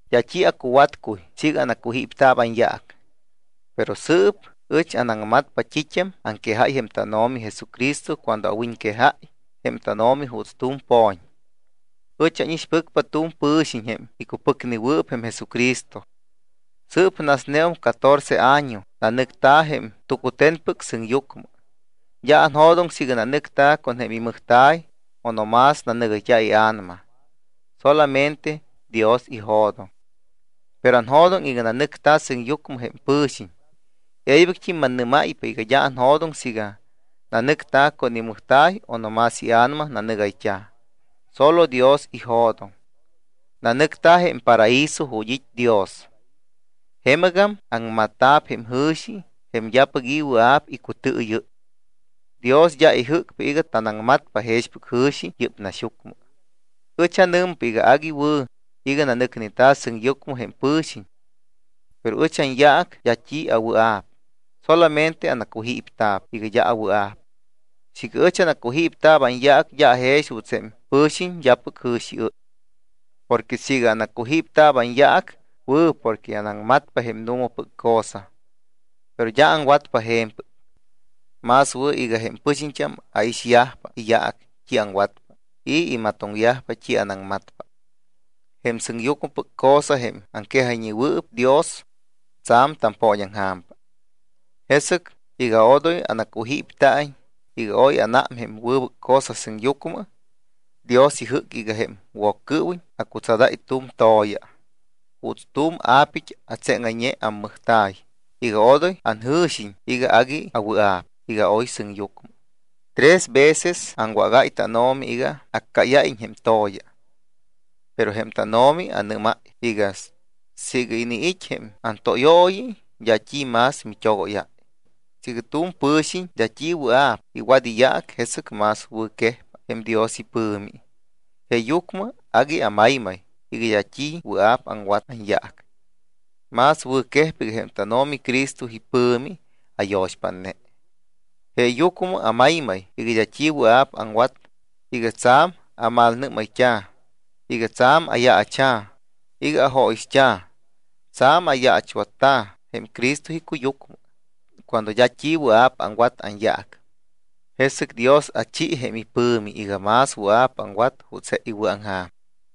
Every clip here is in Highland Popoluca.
D́a t́i acuwatcuy siiga anacujípta̱p anyaac. Pero sɨɨp ɨch anaŋmatpa t́it́am aŋquejáy jém tánO̱mi Jesucristo cuando awiñquejáy jém tánO̱mi juuts tu̱m po̱ñ. Ɨch ánixpɨcpa tu̱m pɨ̱xiñ jém icupɨcnewɨɨp jém Jesucristo. Sɨɨp nasneum catorce año nanɨcta̱ jém tucute̱npɨc sɨŋyucmɨ. D́a tanjo̱doŋ siiga nanɨcta̱ con jém imɨjta̱y o no más nanɨgayt́a̱ ia̱nama, solamente Dios ijo̱doŋ. Pero anjo̱doŋ iga nanɨcta̱ sɨŋyucmɨ jém pɨ̱xiñ. E̱ybɨct́im mannɨ́máypa iga d́a anjo̱doŋ siiga nanɨcta̱ con imɨjta̱y o no más ia̱nama nanɨgayt́a̱. Sólo Dios ijo̱doŋ. Nanɨcta̱ jém paraíso ju̱t́ it́ Dios. Jemɨgam aŋmatta̱p jém jɨ̱xi jém d́apɨc i̱ wɨa̱p icutɨɨyɨ́y. Dios d́a ijɨ́cpa iga tanaŋmatpa jexpɨc jɨ̱xi yɨ́p naxyucmɨ. Ɨch anɨmpa iga agui wɨ̱ iga nanɨcneta̱ sɨŋyucmɨ jém pɨ̱xiñ. Pero ɨch anyaac d́a t́i awɨa̱p. Solamente anacujípta̱p iga d́a awɨa̱p. Siiga ɨch anacujípta̱p anyaac d́a ajex juuts jém pɨ̱xiñ d́apɨc jɨ̱xiɨ́y. Porque siiga anacujípta̱p anyaac, wɨ̱ porque anaŋmatpa jém nu̱mapɨc cosa. Pero d́a aŋwatpa je̱mpɨc. Más wɨ̱ iga jém pɨxiñt́am aixyajpa iyaac t́i aŋwatpa y imatoŋyajpa t́i anaŋmatpa. Jém sɨŋyucmɨpɨc cosa, jém aŋquejayñewɨɨp Dios, tsa̱m tampooñaŋja̱mpa. Jesɨc iga odoy anacujípta̱iñ iga oy anám jém wɨbɨc cosa sɨŋyucmɨ, Dios ijɨ́c iga jém Woccɨɨwiñ acutsadáy tu̱m to̱ya juuts tu̱m apit́ atseŋayñe ammɨjta̱y iga odoy anjɨ̱xiñ iga agui awɨa̱p iga aoy sɨŋyucmɨ. Tres veces aŋwágáy tánO̱mi iga accáyáyiñ jém to̱ya. Pero jém tánO̱mi anɨ́máy iga: “Siiga iniit́ jém antóyooyi d́a t́i más mit́ogóyáy. Siiga tu̱m pɨ̱xiñ d́a t́i wɨa̱p iwat iyaac, jesɨc más wɨ̱quejpa jém Dios ipɨ̱mi.” Jeeyucmɨ agui amaymay iga d́a t́i wɨa̱p aŋwat anyaac. Más wɨ̱quejpa iga jém tánO̱mi Cristo ipɨ̱mi ayo̱xpátne. Jeeyucmɨ amaymay iga d́a t́i wɨa̱p aŋwat iga tsa̱m amalnɨ́mayt́a̱, iga tsa̱m ayaacha̱, iga ajóyixt́a̱, tsa̱m ayaachwatta̱ jém Cristo icuyucmɨ. Cuando d́a t́i wɨa̱p aŋwat anyaac, jesɨc Dios achi jém ipɨ̱mi iga más wɨa̱p aŋwat juuts je iwɨ̱aŋja̱m.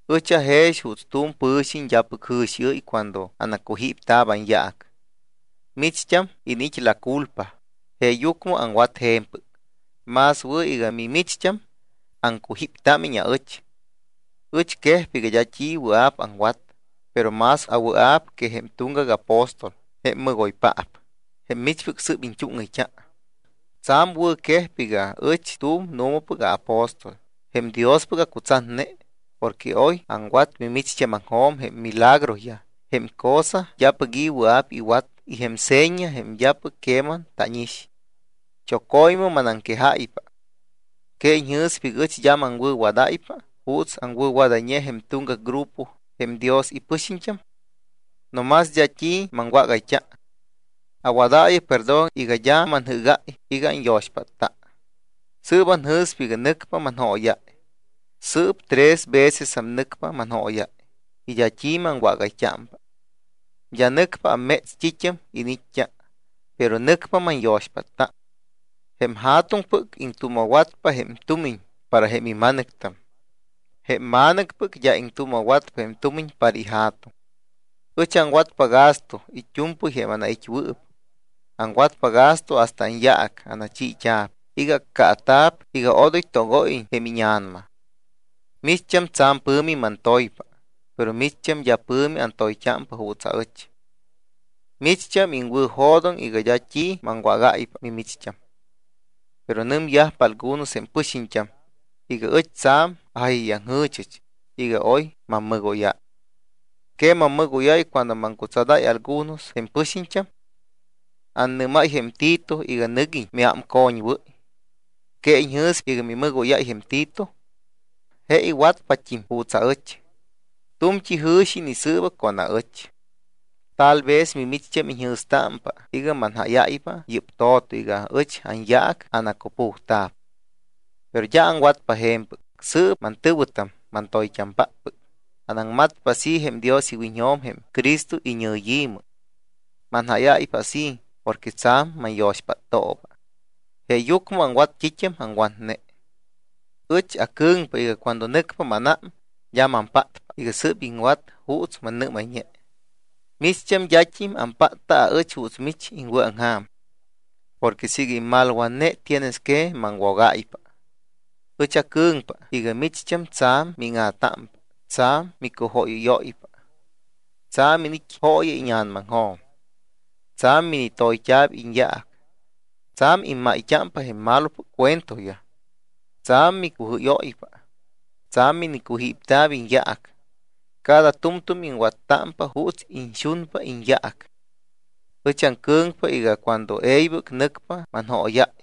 Ɨch ajex juuts tu̱m pɨ̱xiñ d́apɨc jɨ̱xiɨ́y cuando anacujípta̱p anyaac. Micht́am iniit́ la culpa, jeeyucmɨ aŋwat je̱mpɨc. Más wɨ̱ iga mimicht́am aŋcujíptámiñ aɨch. Ɨch quejpa iga d́a t́i wɨa̱p aŋwat, pero más awɨa̱p que jém tuŋgac apóstol, jém mɨgoypaap jém michpɨc sɨ́p iñt́úŋɨyt́a. Tsa̱m wɨ̱ quejpa iga ɨch tu̱m nu̱mapɨc aapóstol jém Diospɨc acutsatne porque oy aŋwat mimicht́ámaŋjo̱m jém milagroyaj, jém cosa d́apɨc i̱ wɨa̱p iwat y jém seña jém d́apɨc queman tánix. Choco̱ymɨ manaŋquejáypa. ¿Que iñjɨ̱spa iga ɨch d́a maŋwɨ̱wadáypa juuts aŋwɨ̱wadayñe jém tuŋgac grupo jém Dios ipɨxiñt́am? No más d́a t́i maŋwágayt́a. Awadaayɨ perdón iga d́a manjɨ́gáy iga anyo̱xpátta. Sɨɨp anjɨ̱spa iga nɨcpa manjóyáy. Sɨɨp tres vecesam nɨcpa manjóyáy. Y d́a t́i maŋwágayt́ámpa. D́a nɨcpa amméts t́it́am iniit́t́a. Pero nɨcpa manyo̱xpátta. Jém ja̱tuŋpɨc iŋtuuma̱watpa jém tumiñ para jém ima̱nɨctam. Jém ma̱nɨcpɨc d́a iŋtuuma̱watpa jém tumiñ para jém ija̱tuŋ. Ɨch aŋwatpa gasto it́u̱mpɨy jém anait́wɨɨp. Aŋwatpa gasto hasta anyaac anachiit́a̱p iga accaata̱p iga odoy togóyiñ jém íña̱nama. Micht́am tsa̱m pɨ̱mi mantoypa, pero micht́am d́a pɨ̱mi antoyt́ámpa juuts aɨch. Micht́am iŋwɨ̱jo̱doŋ iga d́a t́i maŋwágáypa mimicht́am. Pero nɨmyajpa algunos jém pɨxiñt́am iga ɨch tsa̱m ajáyayaŋjɨ̱chɨch iga oy mammɨgóyáy. ¿Que mammɨgóyáy cuando maŋcutsadáy algunos jém pɨxiñt́am? Annɨ́máy jém Tito iga nɨguiñ miámcoñwɨ́y. ¿Que iñjɨ̱spa iga mimɨgóyáy jém Tito? Je iwatpat́im juuts aɨch. Tu̱mt́i jɨ̱xi inisɨɨba con aɨch. Tal vez micht́am iñjɨ̱stámpa iga manjáyáypa yɨ́p to̱to iga ɨch anyaac anacupujta̱p. Pero d́a aŋwatpa je̱mpɨc. Sɨɨp, mantɨ̱wɨtam, mantoyt́ampáppɨc, anaŋmatpa así jém Dios iwiñjo̱m jém Cristo iñɨyi̱mɨ. Manjáyáypa así porque tsa̱m manyo̱xpáttooba. Jeeyucmɨ aŋwat t́it́am aŋwatne. Ɨch acɨ̱ŋpa iga cuando nɨcpa mánám d́a mampátpa iga sɨ́p iŋwat juuts mannɨ́mayñe. Micht́am d́at́im ampátpa aɨch juuts mich iŋwɨ̱aŋja̱m porque siiga immalwatne tienes que maŋwogáypa. Ɨch aŋcɨ̱ŋpa iga micht́am tsa̱m míŋa̱támpa, tsa̱m micujóyɨ́yóypa, tsa̱m iniit́ jooya íña̱namaŋjo̱m, tsa̱m minitoyt́a̱p iñyaac, tsa̱m immayt́ámpa jém malopɨc cuentoyaj, tsa̱m micujɨ́yóypa, tsa̱m minicujípta̱p iñyaac, cada tu̱mtu̱m iŋwattámpa juuts iñxunpa iñyaac. Ɨch aŋcɨ̱ŋpa iga cuando e̱ybɨc nɨcpa manjóyáy,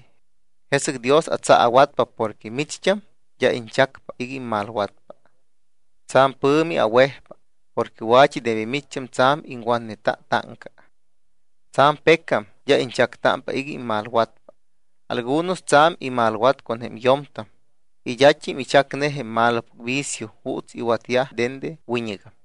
jesɨc Dios atsaawatpa porque micht́am d́a iñchacpa iga immalwatpa. Tsa̱m pɨ̱mi awejpa porque wa̱t́i de micht́am tsa̱m iŋwatneta táŋca. Tsa̱m pecam d́a iñchactámpa iga immalwatpa. Algunos tsa̱m imalwat con jém yo̱mtam y d́at́im ichacne jém malopɨc vicio juuts iwatyajpa dende wiñɨgam.